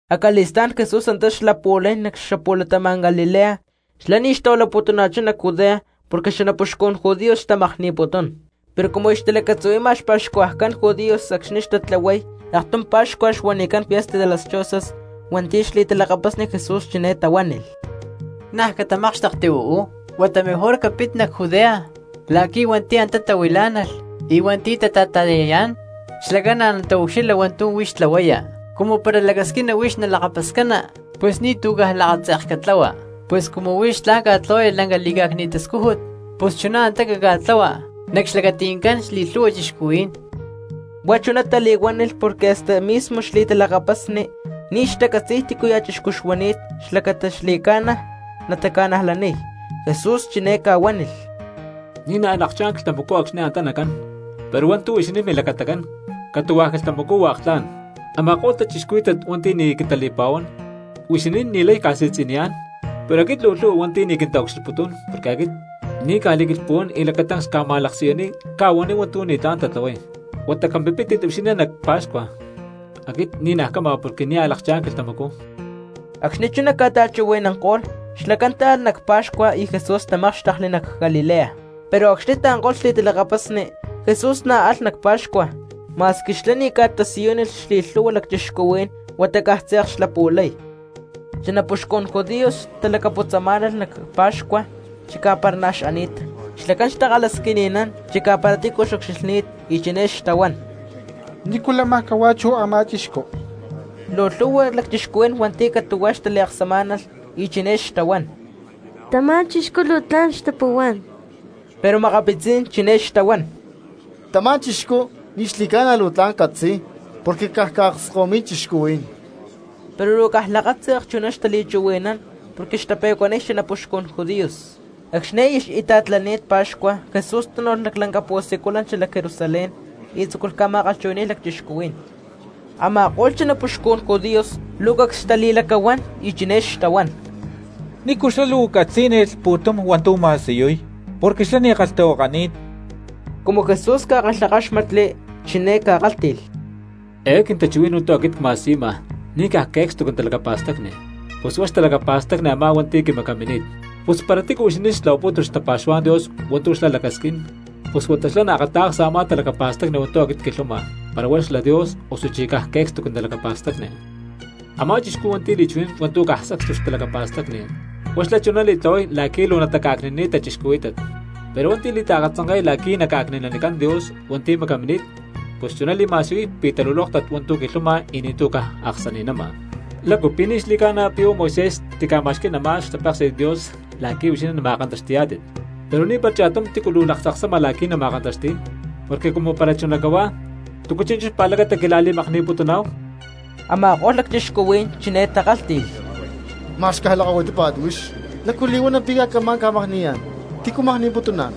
Acali̠stá̠n Jesús antá xlapu̠lay nac xapu̠latama̠n Galilea. Xlá ni̠ xtahuilaputuna̠chá nac Judea porque xanapuxcun judíos xtamakni̠putún. Pero cumu aya xtalacatzuhui̠ma xpa̠xcuajcán judíos acxni̠ xtatlahuay aktum paxcua xuanicán fiesta de las chozas, hua̠nti̠ xli̠talakapasni Jesús chiné tahuánilh: —Niaj catamákxtekti uú, huata mejor capit nac Judea la̠qui̠ hua̠nti̠ antá tahuilá̠nalh y hua̠nti̠ antá tata̠ta̠yayá̠n xlacán na̠ nataucxilha hua̠ntu̠ huix tlahuaya. Cumu para lacasquina huix nalakapascana, pus ni̠tu̠ caj lakatze̠k catlahua. Pus cumu huix tla̠n ca̠tlahuaya laclanca li̠cá̠cni̠t tascújut, pus chuná antá caca̠tlahua nac xlacati̠ncán xli̠lhu̠hua cristianos. Huá chuná tali̠huánilh porque hasta mismo xli̠talakapasni ni̠ xtacatzi̠y tícuya̠ chixcú xuani̠t xlacata xli̠ca̠na nataca̠najlaniy. Jesús chiné ca̠huánilh: —Ni̠ naj a̠ lakchá̠n quilhtamacú acxni̠ antá nacán, pero hua̠ntu̠ huixinín milacatacán catu̠huá quilhtamacú hua̠k tla̠n. Ama̠ko̠lh cristianos hua̠nti̠ ni̠ quintali̠pa̠huán huixinín ni̠lay ca̠si̠tzi̠niyá̠n; pero aquit luu lhu̠hua hua̠nti̠ ni̠ quintaucxilhputún porque aquit ni̠ cca̠li̠quilhpuwán y lacatancs cca̠ma̠laksiyuniy cca̠huaniy hua̠ntu̠ ni̠tlá̠n tatlahuay. Huata capimpítit huixinín nac pa̠xcua, aquit ni̠naj cama porque nia̠ lakchá̠n quilhtamacú. Acxni̠ chuná ca̠ta̠chuhui̠nanko̠lh, xlacán táalh nac pa̠xcua y Jesús tamákxtekli nac Galilea. Pero acxni̠ taanko̠lh xli̠talakapasni, Jesús na̠ alh nac pa̠xcua, ma̠squi xlá ni̠ ca̠tasiyúnilh xli̠lhu̠hua cristianos huata caj tze̠k xlapu̠lay. Xanapuxcun judíos xtalacaputzamá̠nalh nac pa̠xcua chicá para na̠ xani̠t, xlacán xtakalhasquini̠nán chicá para tícu xucxilhni̠t, y chiné xtahuán: —¿Ni̠cu láma cahuá chú a̠má chixcú? Luu lhu̠hua cristianos hua̠nti̠ catu̠huá xtaliaksamá̠nalh, y chiné xtahuán: “Tamá chixcú luu tla̠n xtapuhuá̠n”, pero makapitzí̠n chiné xtahuán: “Tamá chixcú ni̠ xli̠ca̠na luu tla̠n catzi̠y, porque caj ca̠akskahuimi̠y cristianos.” Pero luu caj lakatze̠k chuná xtali̠chuhui̠nán porque xtape̠cuaniy xanapuxcún judíos. Acxni̠ aya xita̠tlani̠t pa̠xcua Jesús tánu̠lh nac lanca pu̠siculan xalac Jerusalén y tzúculh ca̠ma̠kalhchuhui̠ni̠y cristianos. Ama̠ko̠lh xanapuxcun judíos luu cacs xtali̠lacahuán y chiné xtahuán: —¿Nícu xlá luu catzí̠nilh pu̠tum hua̠ntu̠ ma̠siyuy porque xlá ni̠ kalhtahuakani̠t? Cumu Jesús ca̠kalhakáxmatli chiné ca̠kálhti̠lh: —Eé quintachuhui̠n hua̠ntu̠ aquit cma̠siyuma ni̠ caj que̠cstu quintalacapa̠stacni, pus huá xtalacapa̠stacni a̠má hua̠nti̠ quimacamini̠t. Pus para tícu huixinín xtlahuapútulh xtapa̠xuhuá̠n Dios hua̠ntu̠ xlá lacasquín, pus huata xlá naakata̠ksa a̠má talacapa̠stacni hua̠ntu̠ aquit cquilhuama para huá xla Dios osuchí caj que̠cstu quintalacapa̠stacni. Amá chixcú hua̠nti̠ li̠chuhui̠nán hua̠ntu̠ caj sacstu xtalacapa̠stacni, huá xlá chuná li̠tlahuay la̠qui̠ luu nataca̠cni̠naniy cristianos; pero hua̠nti̠ li̠taakatzanke̠y la̠qui̠ naca̠cni̠nanicán Dios hua̠nti̠ macamini̠t, pus chuná li̠ma̠siyuy pi̠ talulóktat hua̠ntu̠ quilhuama y ni̠tu̠ caj aksani̠nama. ¿Lácu pi̠ ni̠ xli̠ca̠na pi̠ huá Moisés tica̠ma̠xquí̠n a̠má xtapéksi̠t Dios la̠qui̠ huixinín nama̠kantaxti̠yá̠tit? Pero ni̠para cha̠tum tícu luu laktzaksama la̠qui̠ nama̠kantaxti̠y. Porque cumu para chuná cahuá, ¿túcu chi̠nchú xpa̠lacata quila̠li̠makni̠putuná̠hu? Ama̠ko̠lh cristianos chiné takálhti̠lh: —Ma̠x caj lakahuitípa̠t huix. ¿Lácu li̠huana pi̠ camá̠n ca̠makni̠yá̠n? ¿Tícu makni̠putuná̠n?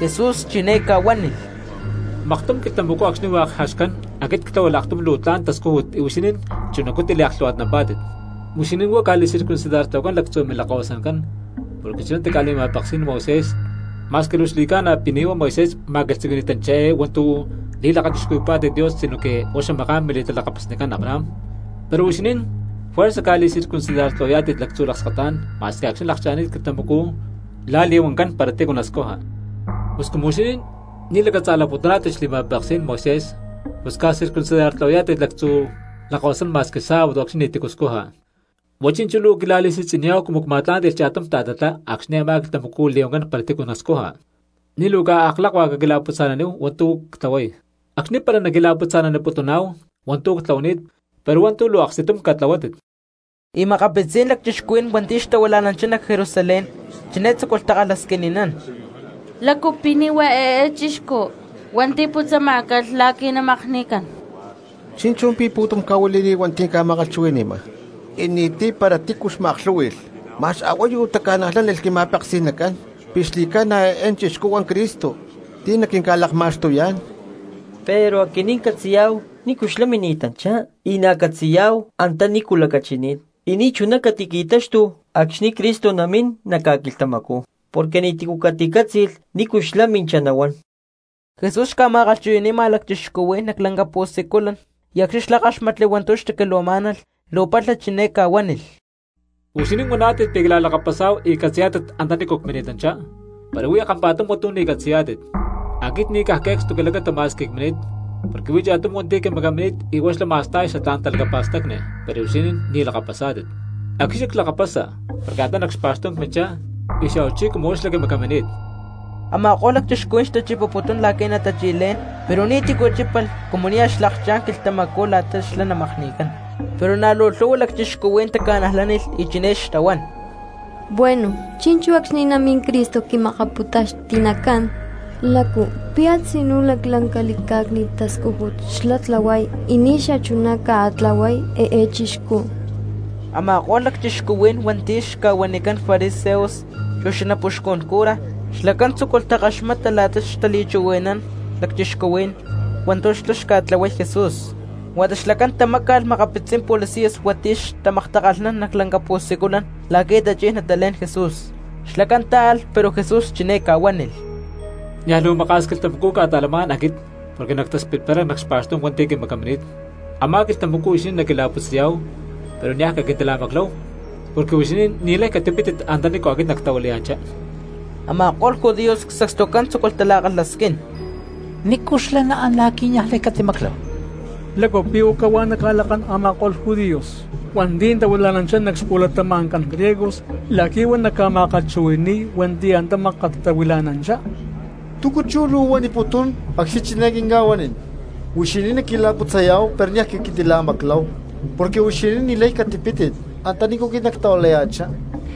Jesús chiné ca̠huánilh: —Maktum quilhtamacú acxni̠ hua̠k jaxcán aquit ctláhualh aktum luu tla̠n tascújut y huixinín chunacú tiliaklhu̠hua̠tnampá̠tit. Huixinín huá ca̠li̠circuncidartlahuacán lactzu̠ milakkahuasacán porque chuná tica̠li̠ma̠peksí̠n Moisés (ma̠squi luu xli̠ca̠na pi̠ ni̠ huá Moisés ma̠quilhtzuqui̠ni̠tanchá eé hua̠ntu̠ li̠lakachixcuhui̠yá̠tit Dios sinoque huá xamaká̠n mili̠talakapasnicán Abraham), pero huixinín fuerza ca̠circuncidartlahuayá̠tit lactzu̠ lakskatá̠n ma̠squi acxni̠ lakcha̠ni̠t quilhtamacú la̠ li̠huancán para tícu nascuja. Pus cumu huixinín ni̠ lacatza̠laputuná̠tit xli̠ma̠peksí̠n Moisés pus ca̠circuncidartlahuayá̠tit lactzu̠ lakahuasán ma̠squi sábado acxni̠ ni̠tícu scuja, ¿huá chi̠nchú luu quila̠li̠si̠tzi̠niyá̠hu cumu cma̠tlánti̠lh cha̠tum ta̠tatlá acxni̠ a̠má quilhtamacú li̠huancán para tícu nascuja? Ni̠ luu caj aklakuá caquila̠putza̠naníhu hua̠ntu̠ ctlahuay. Acxni̠ para naquila̠putza̠naniputuná̠hu hua̠ntu̠ ctlahuani̠t pero hua̠ntu̠ luu aksti̠tum catlahuátit. Y makapitzí̠n cristianos hua̠nti̠ xtahuila̠nanchá nac Jerusalén chiné tzúculh takalhasquini̠nán: —¿Lácu pi̠ ni̠ huá eé chixcú hua̠nti̠ putzamá̠calh la̠qui̠ namakni̠cán? Chi̠nchú pi̠ pu̠tum ca̠huili̠ni̠t cristianos, ca̠ma̠kalhchuhui̠ni̠ma y ni̠ti̠ para tícu xma̠aklhú̠hui̠lh. Ma̠x a̠huayu taca̠najlánilh quima̠peksi̠nacán pi̠ xli̠ca̠na eé chixcú huá Cristo ti̠ naquinca̠lakma̠xtuyá̠n. Pero aquinín catzi̠yá̠hu nícu xlá mini̠tanchá y na̠ catzi̠ya̠huá antanícu lacachini̠t; y ni̠chuná catiqui̠táxtulh acxni̠ Cristo namín nac ca̠quilhtamacú, porque ni̠tícu caticátzi̠lh nícu xlá minchá nahuán. Jesús xca̠ma̠kalhchuhui̠ni̠ma cristianos nac lanca pu̠siculan y acxni̠ xlá káxmatli hua̠ntu̠ xtaquilhuamá̠nalh luu palha chiné ca̠huánilh: —¡Huixinín huaná̠tit pi̠ quila̠lakapasá̠hu y catzi̠yá̠tit antanícu cmini̠tanchá! Pero huí kampa̠tum hua̠ntu̠ ni̠ catzi̠yá̠tit, aquit ni̠ caj que̠cstu quilacata ma̠squi cmini̠t, porque huí cha̠tum hua̠nti̠ quimacamini̠t y huá xlá ma̠sta̠y xatlá̠n talacapa̠stacni, pero huixinín ni̠ lakapasá̠tit. Aquit xlá clakapasa porque antá nac xpa̠xtú̠n cminchá, y xa̠huachí cumu huá xlá quimacamini̠t. Ama̠ko̠lh lacchixcuhuí̠n xtachipaputún la̠qui̠ natachi̠lé̠n, pero ni̠tícu chípalh cumu nia̠ xlakchá̠n xquilhtamacú la̠ta xlá namakni̠cán. Pero na̠ luu lhu̠hua cristianos taca̠najlánilh y chiné xtahuán: —Bueno, chi̠nchú acxni̠ namín Cristo quima̠kapu̠taxti̠nacán, ¿lácu pi̠ a̠tzinú laclanca li̠cá̠cni̠t tascújut xlá natlahuay ni̠ xachuná ca̠tlahuay eé chixcú? Ama̠ko̠lh lacchixcuhuí̠n hua̠nti̠ xca̠huanicán fariseos chu xanapuxcun cura, xlacán tzúculh takaxmata la̠ta xtali̠chuhui̠nán cristianos hua̠ntu̠ xlá xtlahuay Jesús, huata xlacán tamáca̠lh makapitzí̠n policías hua̠nti̠ xtamaktakalhnán nac lanca pu̠siculan la̠qui̠ tachí̠n natalé̠n Jesús. Xlacán táalh pero Jesús chiné ca̠huánilh: —Niaj luu maka̠s quilhtamacú cca̠ta̠lamá̠n aquit porque nactaspitparay nac xpa̠xtú̠n hua̠nti̠ quimacamini̠t. Amá quilhtamacú huixinín naquila̠putzayá̠hu pero niaj caquintila̠macláhu porque huixinín ni̠lay catipítit antanícu aquit nactahuilaya̠chá. Ama̠ko̠lh judíos sacstucán tzúculh tala̠kalhasquín: —¿Nícu xlá naán la̠qui̠ aquinín niajlay catimacláhu? ¿Lácu pi̠ huá cahuá naca̠lakán a̠ma̠ko̠lh judíos hua̠nti̠ tahuila̠nanchá nac xpu̠latama̠ncán griegos la̠qui̠ huá naca̠ma̠kalhchuhui̠ni̠y hua̠nti̠ antá mákat tahuila̠nanchá? ¿Túcu chú luu huaniputún acxni̠ chiné quinca̠huanín: “Huixinín naquila̠putzayá̠hu pero niaj caquintila̠macláhu, porque huixinín ni̠lay catipítit antanícu aquit nactahuilaya̠chá”?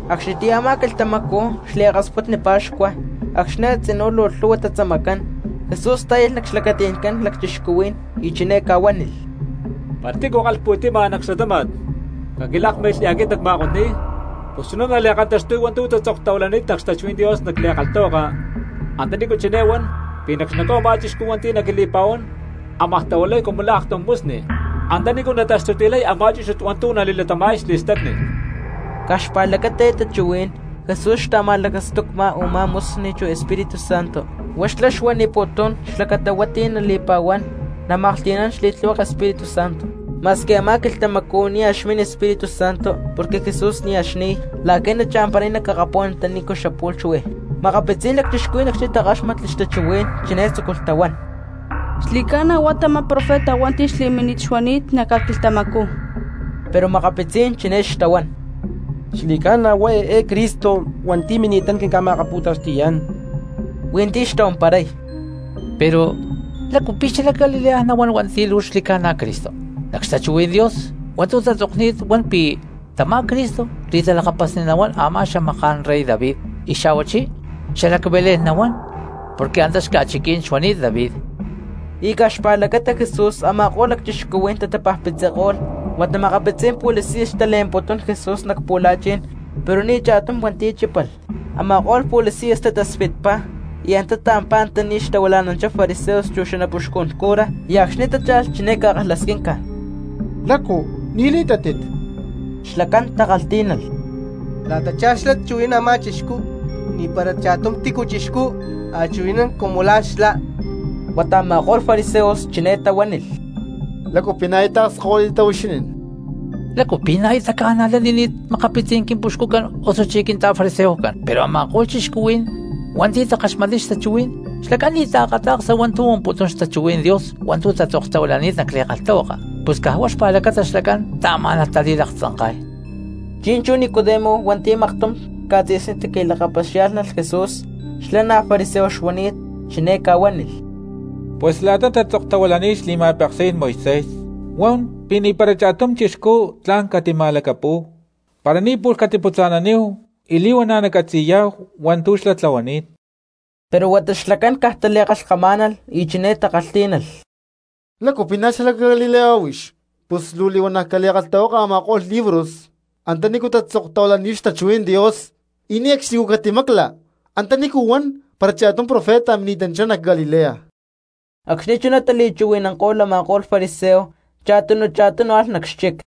Acxnitiyá a̠má quilhtamacú xliakasputni pa̠xcua acxni̠ a̠tzinú luu lhu̠hua xtatzamacán, Jesús tá̠yalh nac xlacati̠ncán cristianos y chiné ca̠huánilh: —Para tícu kalhpu̠ti̠ma nac xlatáma̠t, caquilákmilh y aquit nacma̠kotni̠y. Pus chuná nali̠kantaxtuy hua̠ntu̠ tatzoktahuilani̠t xtachuhuí̠n Dios nac li̠kalhtahuaka antanícu chiné huán pi̠ nac xnacú a̠má cristianos hua̠nti̠ naquili̠pa̠huán ámaj tahuilay cumu la̠ aktum musni antanícu nataxtuti̠lhay a̠má chúchut hua̠ntu̠ nali̠latama̠y xli̠stacni. Caj xpa̠lacata eé xtachuhuí̠n Jesús xta̠ma̠lacastucma a̠má musni chu Espíritu Santo, huá xlá xuaniputún xlacata hua̠nti̠ nali̠pa̠huán namaklhti̠nán xli̠tlihueke Espíritu Santo; ma̠squi a̠má quilhtamacú nia̠ xmin Espíritu Santo porque Jesús nia̠ xni̠y la̠qui̠ nacha̠mparay nac akapú̠n antanícu xapu̠lh xuí. Makapitzí̠n cristianos acxni̠ takáxmatli xtachuhuí̠n, chiné tzúculh tahuán: —Xli̠ca̠na huá tamá profeta hua̠nti̠ xli̠mínit xuani̠t nac ca̠quilhtamacú. Pero makapitzí̠n chiné xtahuán: —Ni̠ xli̠ca̠na huá Cristo hua̠nti̠ mini̠tán quinca̠ma̠akapu̠taxti̠yá̠n. Hui̠nti̠ xtahuamparay: —Pero, ¿lácu pi̠ xalac Galilea nahuán hua̠nti̠ luu xli̠ca̠na Cristo? Nac xtachuhuí̠n Dios hua̠ntu̠ tatzokni̠t huan pi̠ tamá Cristo xli̠talakapasni nahuán a̠má xamaká̠n rey David, y xa̠huachí xalac Belén nahuán porque antá xca̠chiquí̠n xuani̠t David. Y caj xpa̠lacata Jesús a̠ma̠ko̠lh cristianos tatapajpitziko̠lh. Huata makapitzí̠n policías xtale̠mputún Jesús nac pu̠la̠chi̠n pero ni̠ cha̠tum hua̠nti̠ chípalh. Ama̠ko̠lh policías tataspitpá y antá taampá antaní xtahuila̠nanchá fariseos chu xanapuxcun cura, y acxni̠ tácha̠lh chiné ca̠kalhasquinca: —¿Lácu ni̠ li̠tátit? Xlacán takalhtí̠nalh: —La̠tachá xlá chuhui̠nán a̠má chixcú ni̠para cha̠tum tícu chixcú a̠ chuhui̠nán cumu la̠ xlá. Huata a̠ma̠ko̠lh fariseos chiné tahuánilh: —¿Lácu pi̠ na̠ aya taakskahuitittá huixinín? ¿Lácu pi̠ na̠ aya taca̠najlanini̠t makapitzí̠n quimpuxcucán osuchí quinta̠fariseoscán? Pero a̠ma̠ko̠lh cristianos hua̠nti̠ takaxmatniy xtachuhuí̠n, xlacán ni̠ taakata̠ksa hua̠ntu̠ huamputún xtachuhuí̠n Dios hua̠ntu̠ tatzoktahuilani̠t nac li̠kalhtahuaka, pus caj huá xpa̠lacata xlacán taamá̠nalh tali̠laktzanka̠y. Chi̠nchú Nicodemo hua̠nti̠ maktum ca̠tzi̠sní tiqui̠lakapaxiá̠lhnalh Jesús xlá na̠ fariseo xuani̠t, chiné ca̠huánilh: —Pus la̠ta tatzoktahuilani̠t xli̠ma̠peksí̠n Moisés huan pi̠ ni̠para cha̠tum chixcú tla̠n catima̠lacapú̠hu para ni̠ pu̠lh catiputza̠naníhu y li̠huana̠ nacatzi̠yá̠hu hua̠ntu̠ xlá tlahuani̠t. Pero huata xlacán caj tali̠kalhkamá̠nalh y chiné takalhtí̠nalh: —¿Lácu pi̠ na̠ xalac Galilea huix? Pus huata luu li̠huana̠ cali̠kalhtahuaka a̠ma̠ko̠lh libros antanícu tatzoktahuilani̠t xtachuhuí̠n Dios y ne̠cxni catimaclalh antanícu huan para cha̠tum profeta mini̠tanchá nac Galilea. Acxni̠ chuná tachuhui̠nanko̠lh a̠ma̠ko̠lh fariseos cha̠tunu cha̠tunu alh nac xchic.